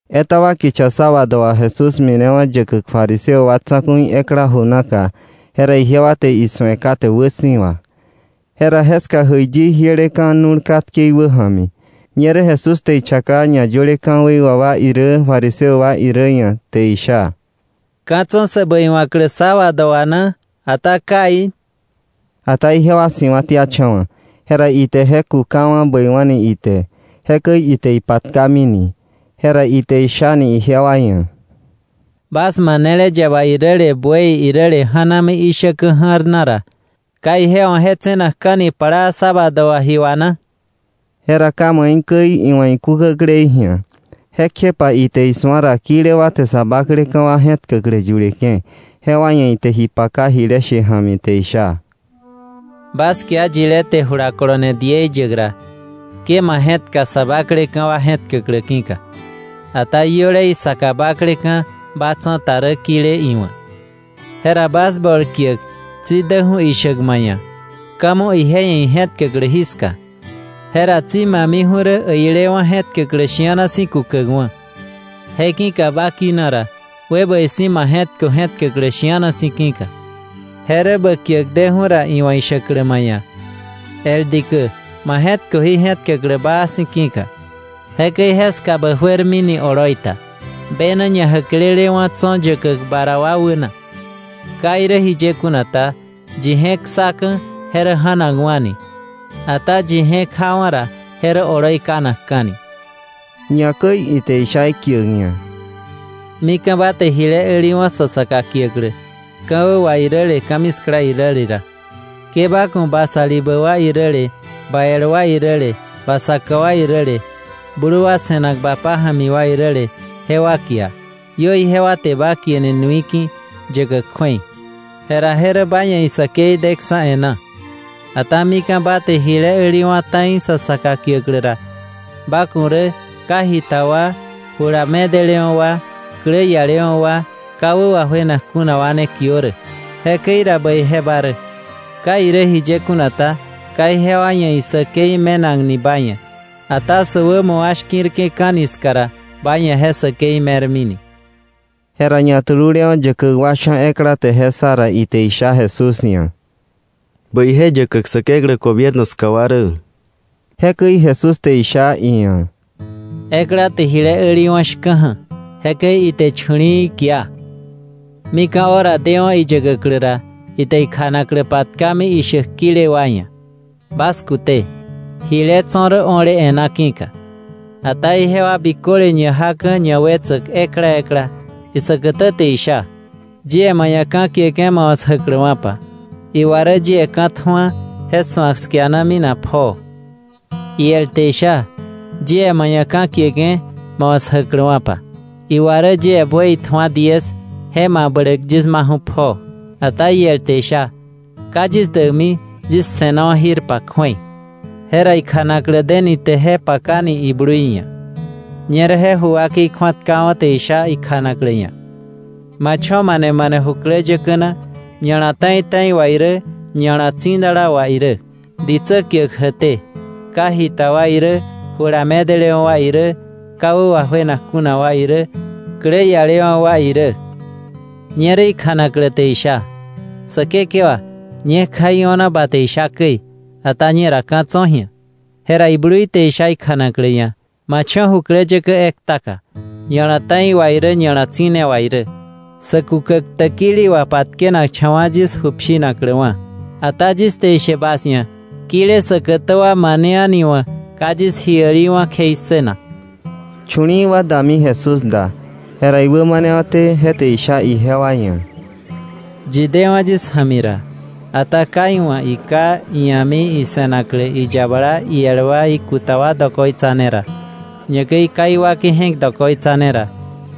Etaba kicha sábado wà Jesús minewa̱ yäkäk fariseo wa tsa̱ku̱i ekla ju naka, jera ijewa te isu̱e kate wäsi̱wa. Jera jeska jäiyi jieleka̱ nu̱l katke iwäja̱mi. Ñerä Jesús te ichaka ñayöle ka̱wei wà wa irä fariseo wa irä ia̱ te isha: —¿Ka̱ tso̱ sä bäiwa̱klä sábado wà na, ata kai? Ata ijewa si̱wa̱tiacha̱wa̱. Jera ite je kukawa̱ bäiwa̱ni ite, jekäi ite ipatkamini. Jera ite ishani ijewa ia̱: —Bas manele yaba iräle buey iräle ja̱nami ishäkä ja̱rna ra, ¿ka ije wa̱ je tse̱nakka̱ni plaa sábado wà ji wà na? Jera ka maikäi iwa̱ ikúkäklei ji̱a. Jekjepa ite isu̱a ra kile wa te sä bakleka̱ wa je̱tkäklä yuleke̱. Jewa ia̱ ite ji paka jile she ja̱mi te isha: —Bas kia yile te jula kolone diei yäk ra, ke ma je̱tka sä bakleka̱ wa je̱tkäklä ki̱ka, ata iöle isaka bakleka̱ ba tsa̱ta rä kile iwa̱, jera bas bol kiäk tsi däju̱ ishäk ma ia̱: ‘Ka̱ mo ije ia̱ ije je̱tkäklä jiska.’ Je ra tsi ma miju̱ rä äilewa̱ je̱k tkäklä shi̱ana si̱ kukäkwa̱. Je ne ki̱ka ba kina ra, we bäi si̱ ma je̱tkö je̱k tkäklä shi̱ana si̱ ki̱ka, je rä bä kiäk deju̱ ra iwa̱ ishäklä ma ia̱: ‘El dikä, ma je̱tköwa̱ ji je̱tkäklä baa si̱ ki̱ka.’ Jekäi jeska bä juermini oloi ta, bena ñajäklelewa̱ tso̱ yäkäk ba ra wa wäna. Ka irä jiye kuna ta, yi je̱k ssaka̱ je rä ja̱nakwa̱ni, ata yi je̱k jawa̱ ra je rä oloi kanakka̱ni. Ñakäi ite isha ikiäk ia̱: —Mika̱ ba te jile äliwa̱ sa saka kiäklä ka̱wä wà iräle ka̱miskla iräle ra, ke ba ku̱ ba salibä wa iräle, ba el wa iräle, ba saka wa iräle, blu wa se̱nak ba pája̱mi wa iräle, jewa kia, iö ijewa te ba kieni nui ki̱ yäkäk kju̱ei, jera je rä ba ia̱ isäkei deksa̱ e̱ná. Ata mika̱ ba te jile äliwa̱ ta̱i sa saka kiäklä ra, ba ku̱ rä ka jita wa, jula medelewa̱ wa, klä ialewa̱ wa, ka wä wajuenak kuna wa ne kiö rä. Jekäi ra bäije ba rä. Ka irä jiye kuna ta, ka ijewa ia̱ isäkei me̱nakni ba ia̱. Ata sä wämo wa shki̱rke̱ka̱ni ska ra, ba ia̱ je säkei me̱rmini. Jera ñatululewa̱ yäkäk wa sha̱ ekla te je ssa ra, ite isha Jesús ia̱: —¡Bäije yäkäk Säkeklä gobierno ska wa rä! Jekäi Jesús te isha iia̱: —Ekla te jile äliwa̱ shka̱ja̱; jekäi ite chu̱li̱i̱ kia. Mika̱ hora dewa̱ iyäkäklä ra, ite ikjanaklä patkami ishäk kile wa ia̱: ‘Bas kute, jile tso̱ rä o̱le e̱ná ki̱ka.’ Ata ijewa biköle ñajaka̱ ñawetsäk ekla ekla. Isäkätä te isha: ‘Yie ma ia̱ ka̱ kieke̱ ba wa̱ 'sjäkläwa̱pa. Iwa rä yie ka̱ tju̱a, je su̱ak 'skiana minak pjoo.’ Iel te isha: ‘Yie ma ia̱ ka̱ kieke̱ ba wa̱ 'sjäkläwa̱pa. Iwa rä yie buey tju̱a diez, je mabläk yis maju̱ pjoo.’ Ata iel te isha: ‘Ka yis däkmi yis se̱nawa̱ jirpa kju̱ei.’ Jera ikjanaklä deni te je pakani iblui ia̱. Ñerä je ju wakei kju̱atkawa̱ te isha ikjanaklä ia̱: ‘Ba cho̱ mane mane jukläyäkä na ña̱la ta̱i ta̱i wà irä, ña̱la tsidala wà irä ditsä kiäk jäkté; ka jita wa irä, jula medelewa̱ wa irä, ka wä wajuenak kuna wa irä, klä ialewa̱ wa irä.’ Ñerä ikjanaklä te isha: ‘Säkekewa, ñekja io̱na ba te isha käi, ata ñera ka̱ tso̱ ji̱a.’ Jera iblui te isha ikjanaklä ia̱: ‘Ma cho̱ jukläyäkä ektaka ña̱la ta̱i wà irä ña̱la tsi̱ne wà irä, sa kukäk täkili wà patkenakcha̱wa̱ yis ju pshinakläwa̱. Ata yis te ishe bas ia̱, kile säkätä wa mane a̱niwa̱ ka yis ji äliwa̱ kjei ssënak.’ Chu̱li̱i̱ wa dami Jesús da, jera iwämanewa̱té je te isha ijewa ia̱: “Yi dewa̱ yis ja̱mi ra, ata ka iwa̱ iká, ia̱mi, ise̱naklä, iyabala, iel wa, ikuta wa dokoitsa ne ra, ñakäi ka iwakei je̱k dokoitsa ne ra,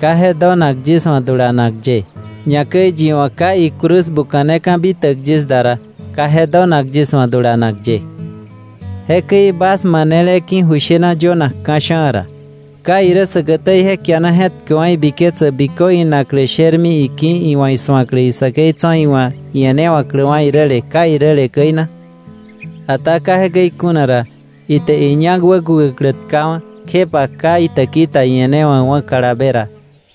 ka je donak yis wa̱ dulanak ye. Ñakäi yi wa̱ ka icruz buka̱neka̱ bitäk yis da ra, ka je donak yis wa̱ dulanak ye. Jekäi bas manele ki̱ ju shena yönak ka̱sha̱a̱ ra, ¿ka irä säkätä ije kiana je̱tkäkwa̱ ibiketsäk bikö inaklä shermi iki̱ iwa̱ isu̱aklä isäkei tso̱ iwa̱ ie̱newa̱kläwa̱ iräle kai iräle käi na? Ata ka jekäi kuna ra, ite iñak wäkukäklä tkawa̱, kjepa ka itäki ta ie̱newa̱kwa̱ kalabe ra,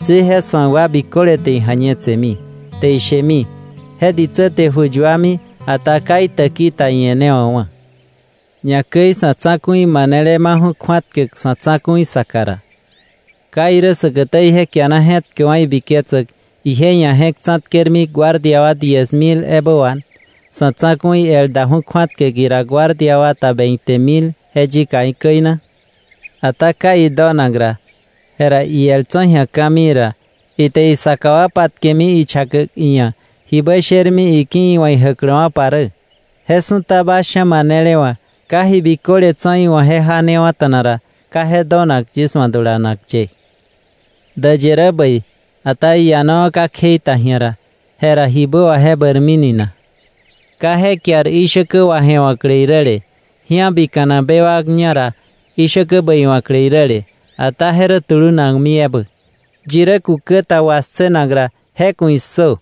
tsi je su̱ak wa biköle te ija̱ñetsemi, te ishemi: ‘Je ditsä te ju yuami, ata ka itäki ta ie̱newa̱k wa̱.’ Ñakäi sa̱ tsa̱ku̱i manele maju̱ kju̱atkäk sa̱ tsa̱ku̱i saka ra, ¿ka irä säkätä ije kiana je̱tkäkwa̱ ibiketsäk ije ia̱ je̱k tsa̱tkermi guardia wa diez mil ebä wà, sa̱ tsa̱ku̱i el daju̱ kju̱atkäk ira guardia wata veinte mil je yikaí̱ käi na? Ata ka idonak ra, jera iel tso̱ ji̱a ka̱mii ra, ite isaka wa patkemi ichakäk iia̱ jibä shermi iki̱ iwa̱ ijäkläwa̱pa rä. Je su̱ta bas sha̱ manele wa̱ ka ji biköle tso̱ iwa̱ je janewa̱ta̱na ra, ka je donak yis wa̱ dulanak ye. “Däyë rä bäi, ata iianawa̱ ka kjei ta ji̱a ra, jera ¿jibä wà je bäirmini na? Ka je kiar ishäkä waje̱wa̱klä iräle, ji̱abika̱nak bewak ñá ra ishäkä bäiwa̱klä iräle, ata je rä tulunakmi ebä. Yi rä kukä ta wassënak ra, ¡je ku̱ issö!”